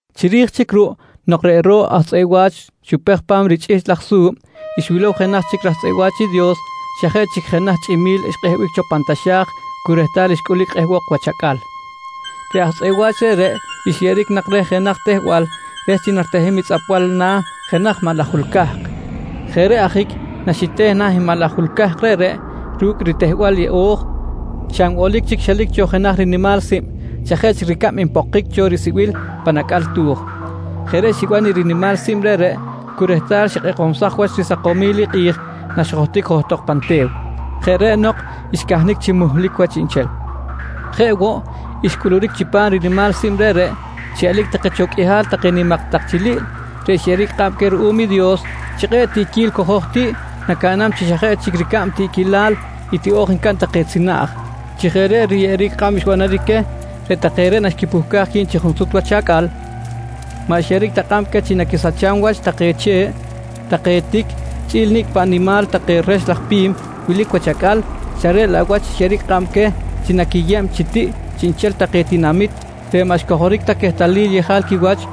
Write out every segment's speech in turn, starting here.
Chiri̱j chic ruꞌ nok reꞌ ro̱ꞌ aj tzꞌeꞌ wa̱ch xupej pa̱m richꞌihchꞌ laj risu̱b, xwilow jenaj chic raj tzꞌeꞌ wa̱ch i Dios xa jeꞌ chic jenaj chꞌimi̱l xkꞌehbic cho pan taxa̱j cu rehtal xcꞌulic kꞌehbok wach acꞌal. Reꞌ raj tzꞌeꞌ wa̱ch reꞌreꞌ xyeꞌeric nak reh jenaj tehbal reh chi naritehem i tzꞌapbal na̱ jenaj maꞌ laj jul cahk. Jeꞌ reꞌ ajic naxiteh na̱ i maꞌ laj jul cahk reꞌreꞌ ru̱cꞌ i ritehbal yeꞌo̱j, xa nbolic chic xelic cho jenaj rinimal sib xa jeꞌ chic ricab npokic cho risibil pan acꞌal tu̱j. Jeꞌ reꞌ xiban i rinimal sib reꞌreꞌ cu rehtal xikꞌekomsaj wach risakomil i kꞌi̱j naxjohtic johtok pan te̱w. Jeꞌ reꞌ nok, xcahnic chi muhlic wach chiꞌnchel. Jeꞌ woꞌ, xcꞌuluric chi chipam rinimal sib reꞌreꞌ xiꞌelic take cho qꞌuihal take nimak tak chiliꞌl reꞌ xyeꞌeric kꞌab queh ruꞌum i Dios chi kꞌe̱ꞌ tiꞌquil cojo̱j tiꞌ nacaꞌnam chi xa jeꞌ chic ricab tiꞌquilal i tiꞌo̱j ncaꞌn take tzinaꞌj. Chi jeꞌ reꞌ riyeꞌeric kꞌab xbanaric queh, reꞌ take reꞌ naxquipuhcaj qui̱b chi junsut wach acꞌal, maꞌ xyeꞌeric ta kꞌab queh chi naquisacham wach take che̱ꞌ, take tic chꞌi̱l nicꞌ paꞌ nimal take rex laj pi̱m wilic wach acꞌal xa reꞌ laꞌ wach xyeꞌeric kꞌab queh chi naquiyeb chi tiꞌ chiꞌnchel take tinamit reꞌ maꞌ xcojoric ta quehtalil yejal quiwach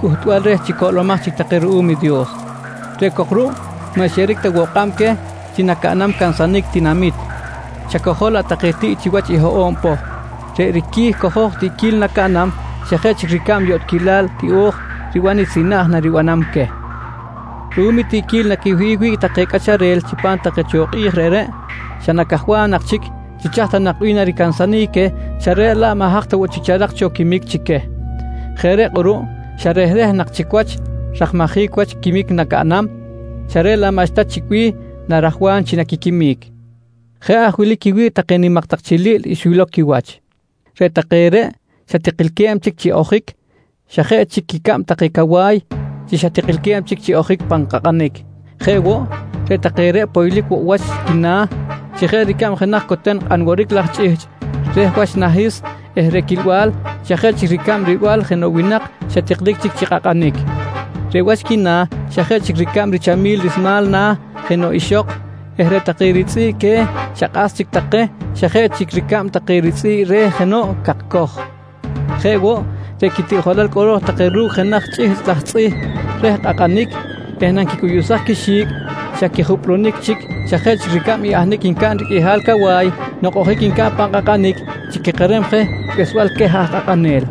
cꞌuhtbal reh chi coꞌlomaj chic take ruꞌum i Dios. Reꞌ cok ruꞌ, maꞌ xyeꞌeric ta kꞌab queh chi nacaꞌnam cansanic tinamit, xa cojol laꞌ take tiꞌ chiwach i hoꞌo̱b poh. Reꞌ riqui̱ cojo̱j tiꞌquil nacaꞌnam, xa jeꞌ chic ricab yotꞌquilal tiꞌo̱j riban i tzinaꞌj naribanam queh. Ruꞌum i tiꞌquil naquiwihꞌic wi̱ꞌ take cꞌacharel chipam take cho kꞌi̱j reꞌreꞌ, xa nacajwam nak chic chi chaj ta nak bih naricansanic queh xa reꞌ laꞌ maꞌ haj ta woꞌ chic charak cho quimic chi queh. Jeꞌ reꞌ kꞌuruꞌ xa rehreh nak chic wach rajmajic wach quiquimic nacaꞌnam xa reꞌ laꞌ maꞌxta chic bih narajwam chi naquiquimic. Jeꞌ aj wili quiwi̱ꞌ take nimak tak chiliꞌl xwilow quiwach: Reꞌ take reꞌ xa tikilque̱b chic chi ojic, xa jeꞌ chic quicab take cawa̱y chi xa tikilque̱b chic chi ojic pan kꞌakꞌanic. Jeꞌ woꞌ, reꞌ take reꞌ poylic woꞌ wach quina̱ chi jeꞌ ricab jenaj coten kꞌanworic laj chꞌihchꞌ reh wach nahis eh reꞌ quilbal xa jeꞌ chic ricab rilbal jenoꞌ winak xa tiklic chic chi kꞌakꞌanic. Reꞌ wach quina̱ xa jeꞌ chic ricab richamil rismal na̱ jenoꞌ ixok eh reꞌ take ritzꞌi̱ꞌ que̱ xa kꞌas chic take xa jeꞌ chic ricab take ritzꞌi̱ꞌ re̱ jenoꞌ cakcoj. Jeꞌ woꞌ, reꞌ quitiꞌjolal cꞌolo̱j take ru̱cꞌ jenaj chꞌihchꞌ laj tzꞌih reh kꞌakꞌanic eh nanquicꞌuyuꞌsaj quixi̱cꞌ xa quijupꞌlunic chic xa jeꞌ chic ricab i ahnic ncaꞌn riqꞌuihal cawa̱y nok ojic ncaꞌn pan kꞌakꞌanic chi quikerem je behsbal queh aj kꞌakꞌanel.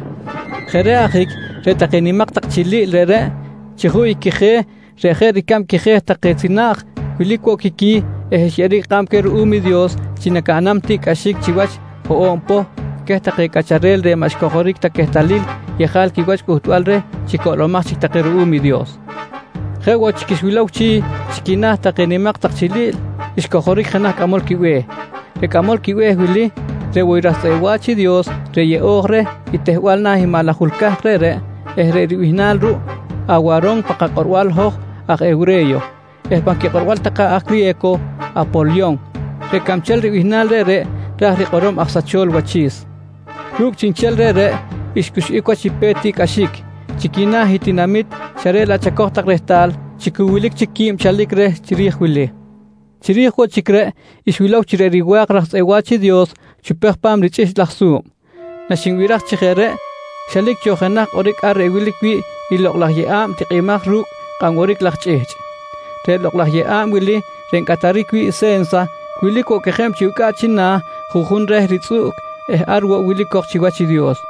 Jeꞌ reꞌ ajic reꞌ take nimak tak chiliꞌl reꞌreꞌ chi juꞌ i quije̱ reꞌ jeꞌ ricab quije̱ take tzinaꞌj, wilic woꞌ quiqui̱ eh xyeꞌeric kꞌab queh ruꞌum i Dios chi nacaꞌnam tiꞌcꞌaxic chiwach hoꞌo̱b poh queh take cꞌacharel reꞌ maꞌ xcojoric ta quehtalil yejal quiwach cꞌuhtbal reh chi coꞌlomaj chic take ruꞌum i Dios. Jeꞌ woꞌ chic xwilow chi, chi quina̱ take nimak tak chiliꞌl, xcojoric jenaj cꞌamol quibe̱h. Reꞌ cꞌamol be̱h wili reꞌ woꞌ i raj tzꞌeꞌ wa̱ch i Dios reꞌ yeꞌo̱j reh i tehbal na̱ i maꞌ laj jul cahk reꞌreꞌ eh reꞌ ribihnal ruꞌ, “Awaron” pan kakꞌorbal hoj aj hewre̱yo eh pan quikꞌorbal take aj criye̱co “Apolyon”. Reꞌ cabchel bihnal reꞌreꞌ, ra̱j rikꞌorom “Aj sachol wachi̱s”. Ru̱cꞌ chiꞌnchel reꞌreꞌ xcuxꞌic wach i pe̱t tiꞌcꞌaxic chi quina̱ i tinamit xa reꞌ laꞌ chacoj tak rehtal chi cu wilic qui̱b chic chalic reh chiri̱j i wili. Chiri̱j woꞌ chic reꞌ xwilow chi reꞌ riwa̱k raj tzꞌeꞌ wa̱ch i Dios xupej pa̱m richꞌihchꞌ laj su̱b. Naxiban chi jeꞌ reꞌ, xelic cho jenaj kꞌoric ar reꞌ wilic wi̱ꞌ i lokꞌ laj yeꞌa̱b tikꞌimaj ru̱cꞌ kꞌan woric laj chꞌihchꞌ. Reꞌ lokꞌ laj yeꞌa̱b wili reꞌ ncꞌataric wi̱ꞌ se̱nsa, wilic woꞌ quejeb chi ucꞌaꞌ china̱, juꞌjun reh ritzꞌuꞌc eh ar woꞌ wilic cok chiwach i Dios.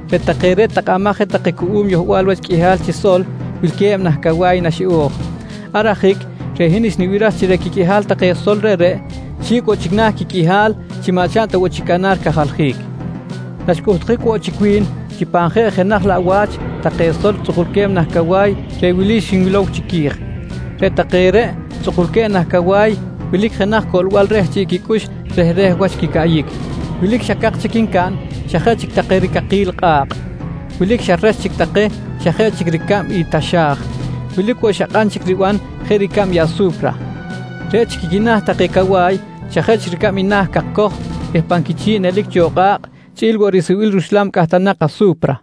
Reꞌ take reꞌ tahkamaj je take cuꞌum yohbal wach qꞌuihal chi sol wilque̱b nah cawa̱y naxiꞌo̱j. Ar ajic reꞌ hin xnibiraj chi reꞌ quiqꞌuihal take sol reꞌreꞌ, xi̱cꞌ woꞌ chic na̱ quiqꞌuihal chi maꞌ chaꞌn ta woꞌ chic canar cajaljic Naxcꞌuhtjic woꞌ chic wi̱n pan jeꞌ jenaj laꞌ wa̱ch take sol reꞌ tzꞌukulque̱b nah cawa̱y reꞌ wili xinwilow chiqui̱j: Reꞌ take reꞌ tzꞌukulque̱b nah cawa̱y wilic jenaj coꞌlbal reh chiꞌ quicꞌux rehreh wach quicaꞌyic. Wilic xa cak chic ncaꞌn xa jeꞌ chic take ricakil kꞌa̱kꞌ. Wilic xa rex chic take xa jeꞌ chic ricab i taxa̱j. Wilic woꞌ xa kꞌan chic riban jeꞌ ricab i asu̱pra. Reꞌ chic i quina̱ take cawa̱y, xa jeꞌ chic ricab na̱ i cakcoj eh pan quichi̱ꞌ nelic cho kꞌa̱kꞌ chꞌi̱l woꞌ risibil ruxla̱b cꞌahtanak asu̱pra.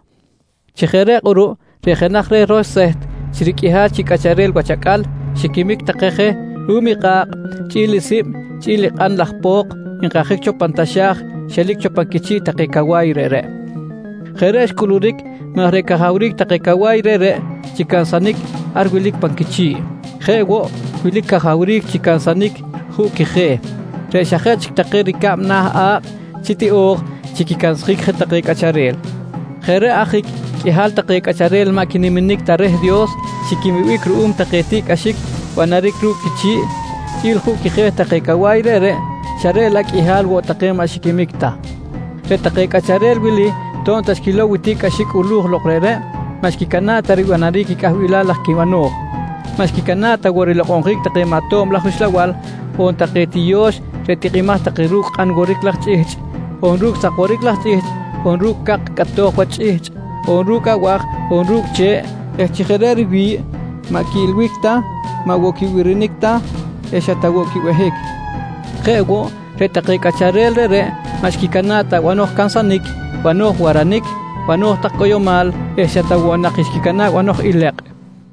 Chi jeꞌ reꞌ kꞌuruꞌ, reꞌ jenaj reh roxseht chi riqꞌuihal chi cꞌacharel wach acꞌal xiquimic take je ruꞌum i kꞌa̱kꞌ chꞌi̱l i sib chꞌi̱l i kꞌan laj po̱k nkajic cho pan taxa̱j xelic cho pan quichi̱ꞌ take cawa̱y reꞌreꞌ. Jeꞌ reꞌ xcꞌuluric maj reꞌ cajawric take cawa̱y reꞌreꞌ chi cansanic ar wilic pan quichi̱ꞌ. Jeꞌ woꞌ, wilic cajawric chi cansanic juꞌ quije̱ reꞌ xa jeꞌ chic take ricab na̱ a̱kꞌ chi tiꞌo̱j chi quicansjic je take cꞌacharel. Jeꞌ reꞌ ajic qꞌuihal take cꞌacharel maꞌ quiniminic ta reh i Dios xiquimibic ruꞌum take tiꞌcꞌaxic banaric ru̱cꞌ quichi̱ꞌ chꞌi̱l juꞌ quije̱ take cawa̱y reꞌreꞌ, xa reꞌ laꞌ qꞌuihal woꞌ take maꞌ xiquimic ta. Reꞌ take cꞌacharel wili to̱b ta xquilow i tiꞌcꞌaxic cꞌulu̱j lok reꞌreꞌ, maꞌ xquicana̱ꞌ ta ribanaric i cꞌahbilal laj quibano̱j, maꞌ xquicana̱ꞌ ta woꞌ rilokꞌonjic wach take maꞌ tob laj uxlabal on take tiyo̱x reꞌ tikꞌimaj take ru̱cꞌ kꞌan woric laj chꞌihchꞌ on ru̱cꞌ sak woric laj chꞌihchꞌ on ru̱cꞌ cak cꞌatoj wach chꞌihchꞌ, on ru̱cꞌ abaj on ru̱cꞌ che̱ꞌ eh chi jeꞌ reꞌ riwi̱ꞌ maꞌ quiꞌilbic ta, maꞌ woꞌ quibirinic ta eh xa ta woꞌ quibehic. Jeꞌ woꞌ, reꞌ take cꞌacharel reꞌreꞌ maꞌ xquicana̱ꞌ ta banoj cansanic, banoj waranic, banoj tak cꞌoyomal eh xa ta woꞌ nak xquicana̱ꞌ banoj ilekꞌ.